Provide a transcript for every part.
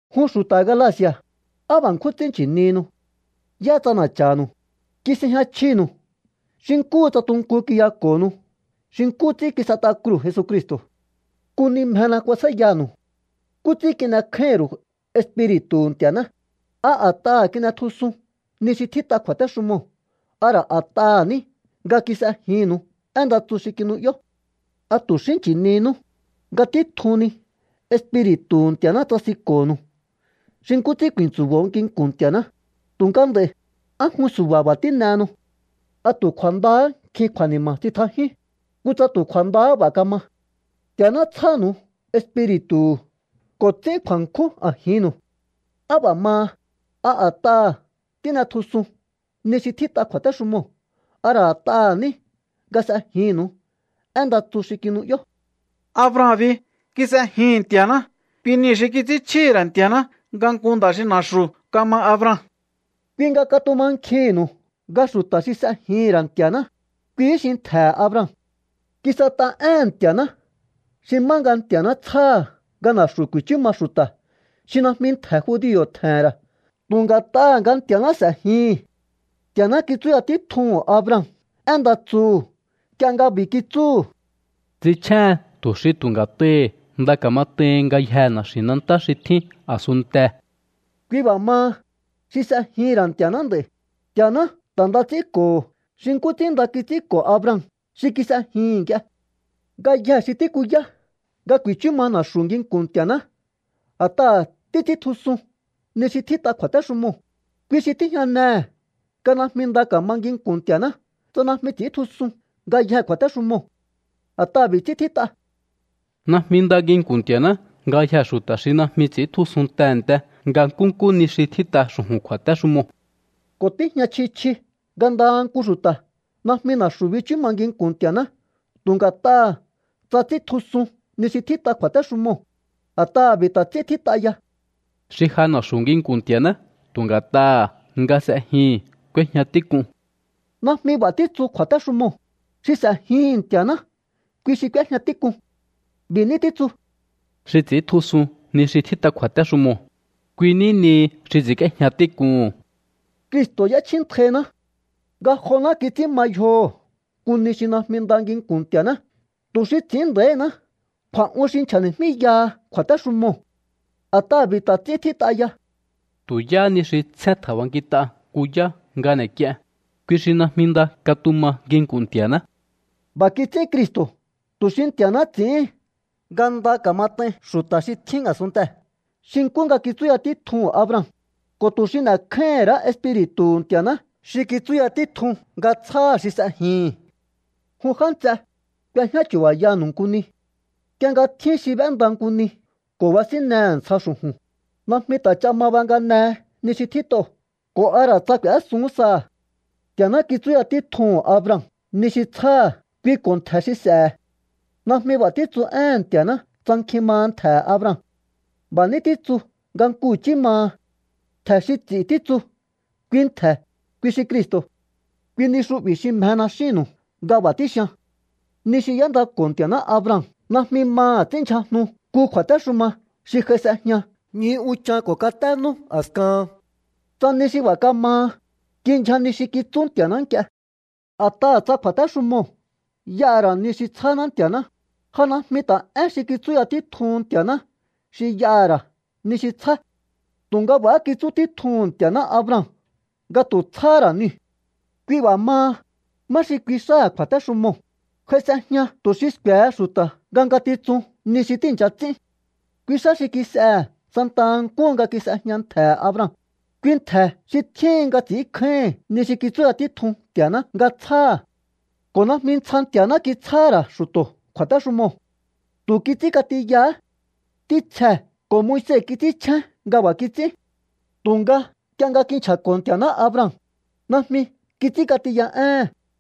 Jun xu̱ta̱ Galaci̱a̱, ¡á b'a̱ ṉkjún ts'ín nchi̱nihinu! ¿Yá ts'ana̱cha̱nu̱u? Kis'ejña chjinu̱u xi nkúhu tsa tunkun kiyako̱honu xi nkú ts'ín kis'et'a kruu̱ Jesucristo̱. Nku ni mjena kuasjáíyanu̱u. ¿Nkú ts'ín kin'ekjáíhi̱n ru̱u Espiri̱tu̱hu̱ Nti̱a̱ná? ¿A a̱t'aha̱ kin'etjusun ni xi tjít'a kju̱a̱téxumoo̱ a ra̱ a̱t'aha̱ ní nga kis'ejinnu̱u én nda tsu xi kinu'yó? ¿A tu̱ xí nchi̱ninú? Nga títjuhu̱n ni Espiri̱tu̱hu̱ Nti̱a̱ná tsasinko̱nu̱u xi nkú ts'ín ku̱i̱ntsu̱bo̱o nginku̱n Nti̱a̱ná, tu̱nga nd'a̱i̱, ¿á jun su̱ba̱ b'a̱ tín'ehenu? ¿A tu̱ kju̱a̱ndahá nkjin kju̱a̱ni̱ma̱ tsitjajíún? ¡Kutsa tu̱ kju̱a̱ndahá b'a̱ kama! Nti̱a̱ná tsjánu̱u Espiri̱tu̱hu̱ ko̱ ts'ín kju̱a̱nkjún a̱jinnu̱u. ¿Á b'a̱ maha? ¿A a̱t'aha̱ tín'etjusun ni xi tjít'a kju̱a̱téxumoo̱ a ra̱ a̱t'aha̱ ní nga s'ejinnu̱u én nda tsu xi kinu'yó? Abraham bi kis'ejihi̱n Nti̱a̱ná. Kui niu̱ xi kits'ínchjíhi̱ ra̱ Nti̱a̱ná nga nku nda̱ xi na̱xu̱ kama Abraham. Kui nga katumankjihi̱nnu̱u nga xu̱ta̱ xi s'ejihi̱n ra̱ Nti̱a̱ná, kuihí xi ntje̱he̱ Abraham. Kis'et'a éhe̱n Nti̱a̱ná xi má nga Nti̱a̱ná tsjáha̱ nga na̱xu̱ ku̱i̱chú ma xu̱ta̱ xi najmi ntje̱ judio̱ tje̱he̱n ra̱ tu̱ nga̱t'aha̱ nga Nti̱a̱ná s'e̱jihi̱n. Nti̱a̱ná kitsúya títjuhu̱n Abraham én nda tsuhu̱ nk'ie nga b'i̱ kitsúhu̱: “Ts'inchjéhen tu̱ xi tu̱ nga̱t'ahi̱ nda ka̱mat'aihin ngayjee̱ na̱xi̱nantá xi tjín a̱sunntee̱.” Kui b'a̱ maha, xi s'ejihi̱n ra̱ Nti̱a̱ná nd'a̱i̱, Nti̱a̱ná ta̱ nda ts'ínko̱ho̱ xi nkú ts'ín nda kits'ínko̱ Abraham xi kis'ejihi̱n nk'ie. Ngayjee̱ xi tíkuyá nga ku̱i̱chú ma na̱xu̱ nginku̱n Nti̱a̱ná a̱t'aha̱ títs'íntjusun ni xi tjít'a kju̱a̱téxumoo̱, kui xi tíjñanehe̱ nga najmi nda ka̱ma nginku̱n Nti̱a̱ná tsa najmi ts'i̱íntjusun ngayjee̱ kju̱a̱téxumoo̱. A̱t'aha̱ b'i̱ ts'ín tjít'a: “Najmi nda nginku̱n Nti̱a̱ná ngayjee̱ xu̱ta̱ xi najmi ts'i̱íntjusun tehe̱nte nga nkúnkú ni xi tjít'a xu̱ju̱n kju̱a̱téxumoo̱.” Ko̱ tíjña chji chji nga ndaha nku xu̱ta̱ najmi na̱xu̱ bichú ma nginku̱n Nti̱a̱ná tu̱ nga̱t'aha̱ tsa ts'íntjusun ni xi tjít'a kju̱a̱téxumoo̱, a̱t'aha̱ b'i̱ ta̱ ts'ín tjít'a ya: “Xi ja na̱xu̱ nginku̱n Nti̱a̱ná tu̱ nga̱t'aha̱ nga s'ejihi̱n k'úéjña tík'un.” Najmi b'a̱ títsu kju̱a̱téxumoo̱: Xi s'e̱jihi̱n Nti̱a̱ná kui xi k'úéjña tík'un. B'i̱ ní títsu: “Xi ts'i̱íntjusun ni xi tjít'a kju̱a̱téxumoo̱, kui ní nihi xi ts'i̱ínk'íéjña tík'uhu̱n.” Cristo̱ y'échjíntainá. Ngajoná kits'ín ma yjoho̱ nku ni xi najmi nda nginku̱n Nti̱a̱ná tu̱ xi ts'i̱ín nda̱íhiná kju̱a̱'un xi nchja̱ni̱jmíyaha kju̱a̱téxumoo̱. A̱t'aha̱ b'i̱ ta̱ ts'ín tjít'a ya: “Tu̱ yáhá ni xi tsjén tje̱nb'ankit'a nku yá nga n'e̱k'ien, kui xi najmi nda katuma nginku̱n Nti̱a̱ná.” B'a̱ kits'ín Cristo̱ tu̱ xi Nti̱a̱ná ts'i̱íhin nga nda ka̱mat'ain xu̱ta̱ xi tjín a̱sunntee̱ xi nkú nga kitsúya títjuhu̱n Abraham, ko̱ tu̱ xi n'e̱kjáíhi̱n ra̱á Espiri̱tu̱hu̱ Nti̱a̱ná xi kitsúya títjun nga tsjáha̱ xi s'ejihi̱n. Jun já nts'e, k'uejñá chu̱ba̱yanu̱u nku ni. Nk'ie nga tjín xi b'énda nku ni ko̱ basínnehe̱ ntsja xu̱ju̱n, najmi ta̱ ch'a ma banganehe ni xi tjít'oo̱ ko̱ a ra̱ tsa k'u̱ésun saha̱. Nti̱a̱ná kitsúya títjuhu̱n Abraham ni xi tsjáha̱ kui ko̱ ntje̱ xi s'e̱he̱. Najmi b'a̱ títsu éhe̱n Nti̱a̱ná tsa nkjin maha ntje̱he̱ Abraham. B'a̱ ní títsu nga nku i̱chí maha. “Ntje̱ xi ts'i̱”, títsu. Kui ntje̱, kui xi Cristo̱. Kui ni xu'bi̱ xi mjena xínnu̱u nga b'a̱ tíxian. Ni xi y'éndako̱ Nti̱a̱ná Abraham najmi maha̱ ts'ínndyjajnu nku kju̱a̱téxuma xi j'ai s'ejña ñju unchan ko̱ katé nú a̱skahan. Tsa ni xi b'a̱ kamaha, kindyja ni xi kitsú Nti̱a̱ná nk'ie. A̱t'aha̱ tsa kju̱a̱téxumoo̱ y'aha̱ ra̱ ni xi tsjáná Nti̱a̱ná, ja najmi ta̱ én xi kitsúya títjuhun Nti̱a̱ná xi y'aha̱ ra̱ ni xi tsjá. Tu̱nga b'a̱há kitsú títjuhu̱n Nti̱a̱ná Abraham nga tu̱ tsjáhá ra̱ niu̱. Kui b'a̱ maha, ¿má xi kui xáha̱ kju̱a̱téxumoo̱? J'ai s'ejña tu̱ xi sku̱e̱he xu̱ta̱ nga ngatitsun ni xi tíi̱ncha ts'ín. Kui xá xi kis'ehe̱ santa nkúhu nga kis'ejña ntje̱he̱ Abraham, kui ntje̱ xi tjíhin nga ts'i̱ínkjáíhi̱n ni xi kitsúya títjun Nti̱a̱ná nga tsjáha̱. Ko̱ najmi ntsja Nti̱a̱ná kitsjáha̱ ra̱ xu̱to̱ kju̱a̱téxumoo̱. Tu̱ kits'ínk'atiyahá. Ntítsjee̱ ko̱ Moise kits'ínchjén nga b'a̱ kits'ín. Tu̱nga nk'ie nga kinchja̱ko̱ Nti̱a̱ná Abraham, najmi kits'ínk'atiya éhe̱n.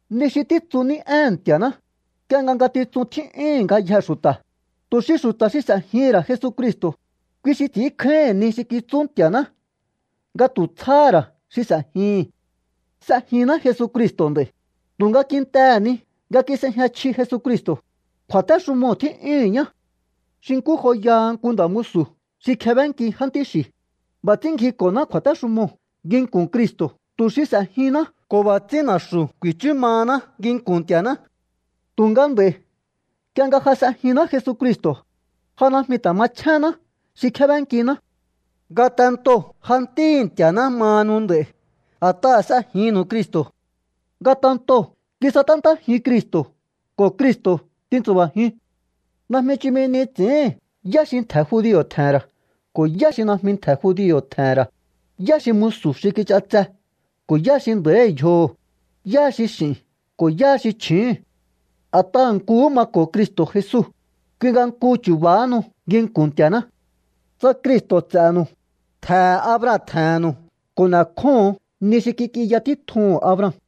Ni xi títsu ní éhe̱n Nti̱a̱ná, nk'ie nga ngatitsuu̱n tjí'yúhu̱n ngayjee̱ xu̱ta̱, tu̱ xi xu̱ta̱ xi s'e̱jihi̱n ra̱ Jesucristo̱, kui xi ts'i̱ínkjáíhi̱n ni xi kitsú Nti̱a̱ná nga tu̱ tsjáhá ra̱ xi s'e̱jihi̱n. S'ejinná Jesucristo̱ nd'a̱i̱, tu̱nga kintehe̱ ni nga kis'ejña chji Jesucristo̱, kju̱a̱téxumoo̱ tjí'yúhu̱n ñá. Xi nkú joyaha nku nda̱ musu̱ xi kjebénki jántí xi̱, b'a̱ ts'ín ngjiko̱ná kju̱a̱téxumoo̱ nginku̱n Cristo̱ tu̱ xi s'e̱jihinná ko̱ b'a̱ ts'ín na̱xu̱ ku̱i̱chú mahaná nginku̱n Nti̱a̱ná. Tu̱nga nd'a̱i̱, nk'ie nga ja s'ejinná Jesucristo̱, ja najmi ta̱ machjéhenná xi kjébénkiná. Ngatentoo̱ ja ntíhi̱ Nti̱a̱ná mahanu nd'a̱i̱, a̱t'aha̱ s'ejinnu̱u Cristo̱. Ngatentoo̱ kisaténtájiun Cristo̱ ko̱ Cristo̱ tintsu̱ba̱jiun. Najmi chumi ni ts'i̱íhi̱n yá xi ntje̱ judio̱ tje̱he̱n ra̱ ko̱ yá xi najmi ntje̱ judio̱ tje̱he̱n ra̱, yá xi musu̱ xi kich'atse ko̱ yá xi nda̱íhi̱ yjoho̱, yá xi x'i̱hi̱n ko̱ yá xi chju̱úhu̱n. A̱t'aha̱ nkuhú mako̱o Cristo̱ Jesu, kui nga nku chu̱ba̱hanu nginku̱n Nti̱a̱ná. Tsa Cristo̱ ts'e̱nu̱u, ntje̱he̱ Abraham tje̱he̱nnu̱u ko̱ n'e̱kjóho̱on ni xi kik'inya títjuhu̱n Abraham.